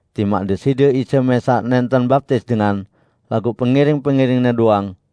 timaq Deside Isa mẽsaq nẽnten baptis dengan, laguq pengiring-pengiring-Ne doang,)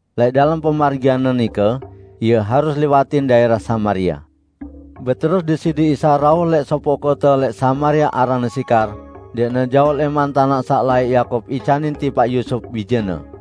Lẽq dalem pemargian-Ne nike, Ie harus liwatin daẽrah Samaria. Beterus Deside Isa rauh lẽq sopoq kote lẽq Samaria aranne Sikar, ndẽqne jaoq lẽman tanaq saq laẽq Yakub icanin tipaq Yusup, bijene.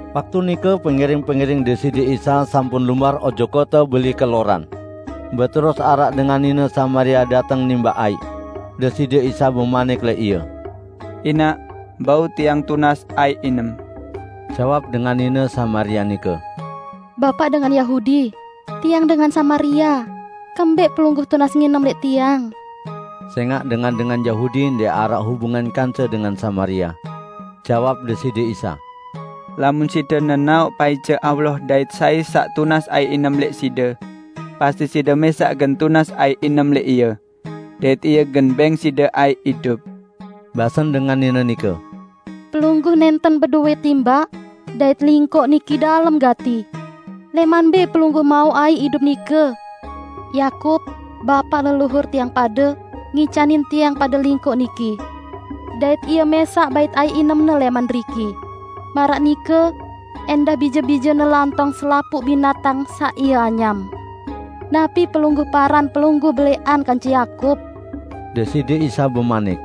Waktu nike pengiring-pengiring Deside Isa sampun lumbar ojok kote beli keloran. Beterus araq dengan nine Samaria dateng nimbaq aiq. Deside Isa bemanik lẽq ie, "Inaq, bau Tiang tunas aiq inem." Jawab dengan nine Samaria nike, "Bapaq dengan Yahudi, tiang dengan Samaria; kembẽq Pelungguh tunas nginem lẽq tiang?" (Sẽngaq dengan-dengan Yahudi ndẽq araq hubungan kance dengan Samaria.) Jawab Deside Isa, "Lamun side nenaoq paice Allah dait sai saq tunas aiq inem lẽq side, pasti side mẽsaq gen tunas aiq inem lẽq Ie, dait Ie gen bẽng side aiq idup." Basen dengan nine nike, "Pelungguh nẽnten bedowẽ timbaq, dait lingkoq niki dalem gati. Lẽman mbẽ Pelungguh mauq aiq idup nike? Yakub, bapaq leluhur tiang pade, ngicanin tiang pade lingkoq niki. Dait ie mẽsaq bait aiq inemne lẽman deriki; maraq nike ẽndah bije-bijene lantong selapuq binatang saq ie anyam. Napi Pelungguh paran Pelungguh belẽqan kance Yakub?" Deside Isa bemanik,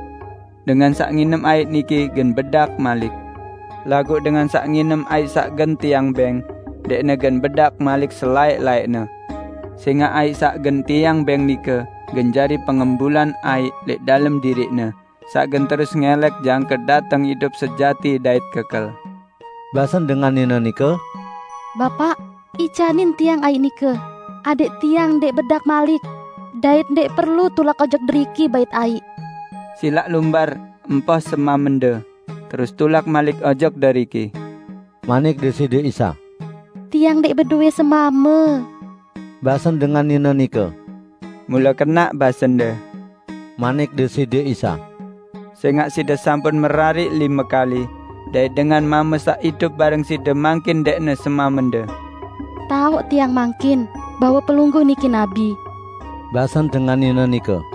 "Dengan saq nginem aiq niki gen bedak malik, laguq dengan saq nginem aiq saq gen Tiang bẽng, ndẽqne gen bedak malik selaẽq-laẽqne. Sẽngaq aiq saq gen Tiang bẽng nike gen jari pengembulan aiq lẽq dalem diriqne saq gen terus ngẽlẽk jangke dateng idup sejati dait kekel." Basen dengan nine nike, "Bapaq, icanin tiang aiq nike, adẽq tiang ndẽq bedak malik; dait ndẽq perlu tulak ojok deriki bait aiq." "Silaq lumbar, empoh semamende, terus tulak malik ojok deriki," manik Deside Isa. "Tiang ndẽq bedowẽ semame," basen dengan nine nike. "Mule kenaq basende," manik Deside Isa. "Sẽngaq side sampun merariq lime kali, dait dengan mame saq idup bareng side mangkin ndẽqne semamende." "Taoq tiang mangkin bahwe Pelungguh niki nabi," basen dengan nine nike.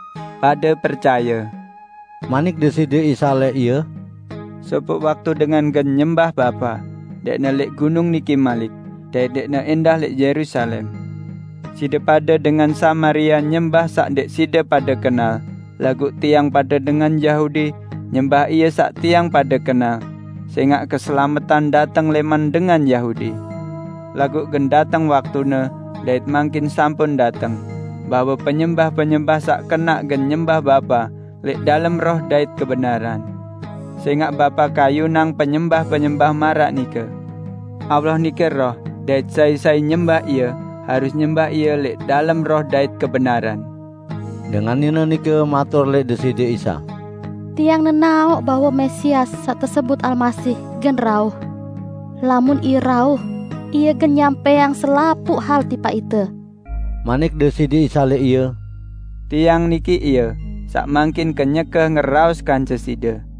"Pade percaye," manik Deside Isa lẽq ie, "sopoq waktu dengan gen nyembah Bapa, ndẽqne lẽq gunung niki malik, dait ndẽqne ẽndah lẽq Yerusalem. Side pade dengan Samaria nyembah saq ndẽq side pade kenal, laguq tiang pade dengan Yahudi nyembah Ie saq tiang pade kenal, sẽngaq keselametan dateng lẽman dengan Yahudi. Laguq gen dateng waktune dait mangkin sampun dateng, bahwe penyembah-penyembah saq kenaq gen nyembah Bapa lẽq dalem roh dait kebenaran; sẽngaq Bapa kayunang penyembah-penyembah maraq nike. Allah nike Roh dait sai-sai nyembah Ie, harus nyembah Ie lẽq dalem roh dait kebenaran." Dengan nine nike matur lẽq Deside Isa, "Tiang nenaoq bahwe Mesias (saq tesebut Almasih) gen rauh. Lamun Ie rauh, Ie gen nyampẽang selapuq hal tipaq ite." Manik Deside Isa lẽq ie, "Tiang niki Ie, saq mangkin kenyeke ngeraos kance side."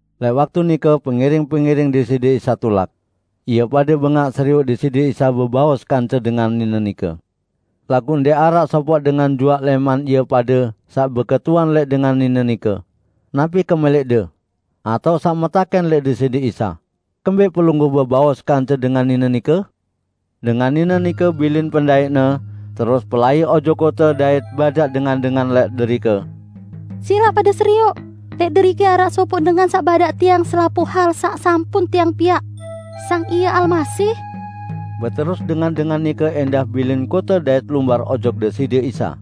Lẽq waktu nike pengiring-pengiring Deside Isa tulak. Ie pade bengaq serioq Deside Isa bebaos kance dengan nine nike. Laguq ndẽq araq sopoq dengan juaq lẽman ie pade saq beketuan lẽq dengan nine nike, "Napi kemẽlẽqde?" atao saq metakẽn lẽq Deside Isa, "Kembẽq Pelungguh bebaos kance dengan nine nike?" Dengan nine nike bilin pendaiqne terus pelai ojok kote dait badaq dengan-dengan lẽq derike, "Silaq pade serioq, lẽq derike araq sopoq dengan saq badaq tiang selapuq hal saq sampun tiang piaq. Sang Ie Almasih?" Beterus dengan-dengan nike ẽndah bilin kote dait lumbar ojok Deside Isa.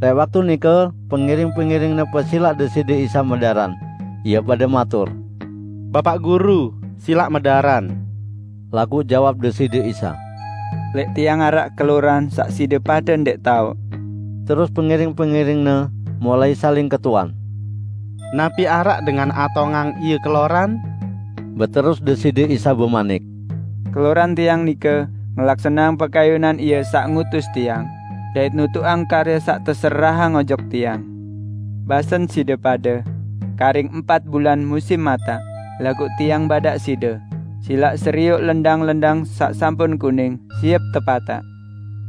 Lẽq waktu nike pengiring-pengiring-Ne pesilaq Deside Isa medaran. Ie pade matur, "Bapaq Guru, silaq medaran." Laguq jawab Deside Isa, "Lẽq Tiang araq keloran saq side pade ndẽq taoq." Beterus pengiring-pengiring-Ne mulai saling ketuan, "Napi araq dengan atongang Ie keloran?" Beterus Deside Isa bemanik, "Keloran Tiang nike, ngelaksaneang pekayunan Ie saq ngutus Tiang, dait nutuqang karye saq teserahang ojok Tiang. Basen side pade, 'Karing empat bulan musim mataq.' Laguq Tiang badaq side: Silaq serioq lendang-lendang saq sampun kuning, siep tepataq!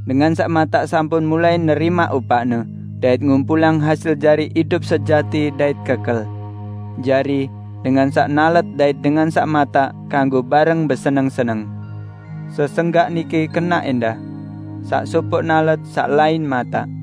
Dengan saq mataq sampun mulai nerimaq upaqne dait ngumpulang hasil jari idup sejati dait kekel. Jari, dengan saq nalet dait dengan saq mataq kanggo bareng beseneng-seneng. Sesenggak niki kenaq ẽndah, 'Saq sopoq nalet, saq lain mataq.'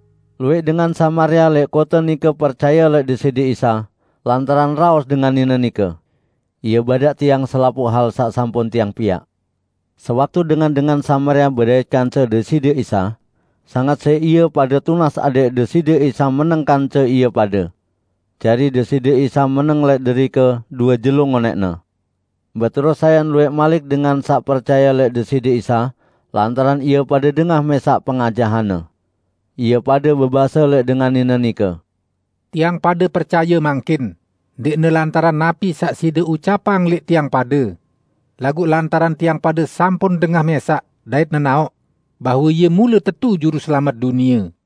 Luwẽq dengan Samaria lẽq kote nike percaye lẽq Deside Isa, lantaran raos dengan nine nike, "Ie badaq tiang selapuq hal saq sampun tiang piaq." Sewaktu dengan-dengan Samaria bedait kance Deside Isa, sanget siq ie pade tunas adẽq Deside Isa meneng kance ie pade. Jari Deside Isa meneng lẽq derike due jelo ngonẽqne. Beterus sayan luwẽq malik dengan saq percaye lẽq Deside Isa lantaran ie pade dengah mẽsaq pengajahan-Ne. Ie pade bebase lẽq dengan nine nike, "Tiang pade percaye mangkin, ndẽqne lantaran napi saq side ucapang lẽq tiang pade, laguq lantaran tiang pade sampun dengah mẽsaq dait nenaoq bahwe Ie mule tetu Juruselamet dunie."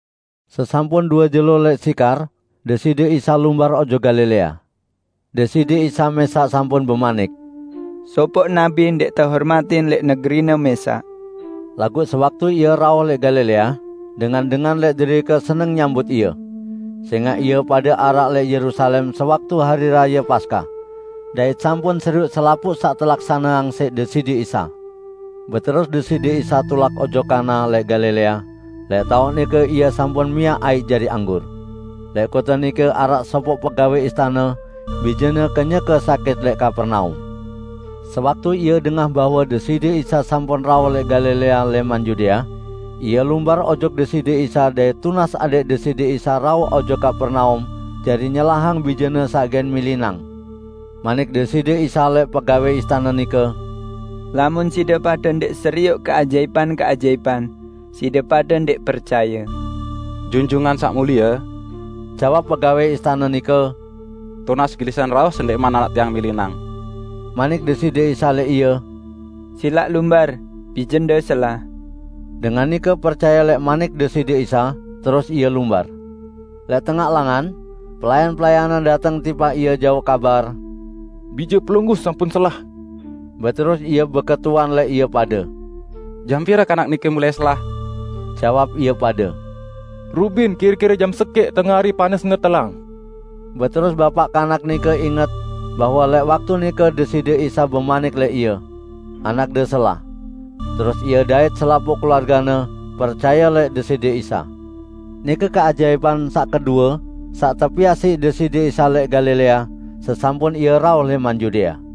Sesampun due jelo lẽq Sikar, Deside Isa lumbar ojok Galilea. Deside Isa mẽsaq sampun bemanik, "Sopoq nabi ndẽq tehormatin lẽq negerine mẽsaq." Laguq sewaktu Ie rauh lẽq Galilea, dengan-dengan lẽq derike seneng nyambut Ie, sẽngaq ie pade araq lẽq Yerusalem sewaktu Hari Raye Paskah, dait sampun serioq selapuq saq telaksaneang siq Deside Isa. Beterus Deside Isa tulak ojok Kana lẽq Galilea, lẽq taoq nike Ie sampun miaq aiq jari anggur. Lẽq kote nike araq sopoq pegawẽ istane, bijene kenyeke sakit lẽq Kapernaum. Sewaktu ie dengah bahwe Deside Isa sampun rauh lẽq Galilea lẽman Yudea, ie lumbar ojok Deside Isa dait tunas adẽq Deside Isa rauh ojok Kapernaum jari nyelahang bijene saq gen milinang. Manik Deside Isa lẽq pegawẽ istane nike, "Lamun side pade ndẽq serioq keajaipan-keajaipan, side pade ndẽq percaye." "Junjungan Saq Mulie," jawab pegawẽ istane nike, "tunas gelisan rauh sendẽqman anak tiang milinang." Manik Deside Isa lẽq ie, "Silaq lumbar, bijende selah!" Dengan nike percaye lẽq manik Deside Isa, terus ie lumbar. Lẽq tengaq langan, pelayan-pelayanne dateng tipaq ie jauq kabar, "Bije pelungguh sampun selah." Beterus ie beketuan lẽq ie pade, "Jam pire kanak nike mulai selah?" Jawab ie pade, "Rubin, kire-kire jam sekẽq tengari panasne telang." Beterus bapaq kanak nike inget bahwe lẽq waktu nike Deside Isa bemanik lẽq ie, "Anakde selah." Terus ie dait selapuq keluargene percaye lẽq Deside Isa. Nike keajaipan saq kedue saq tepiaq siq Deside Isa lẽq Galilea sesampun Ie rauh lẽman Yudea.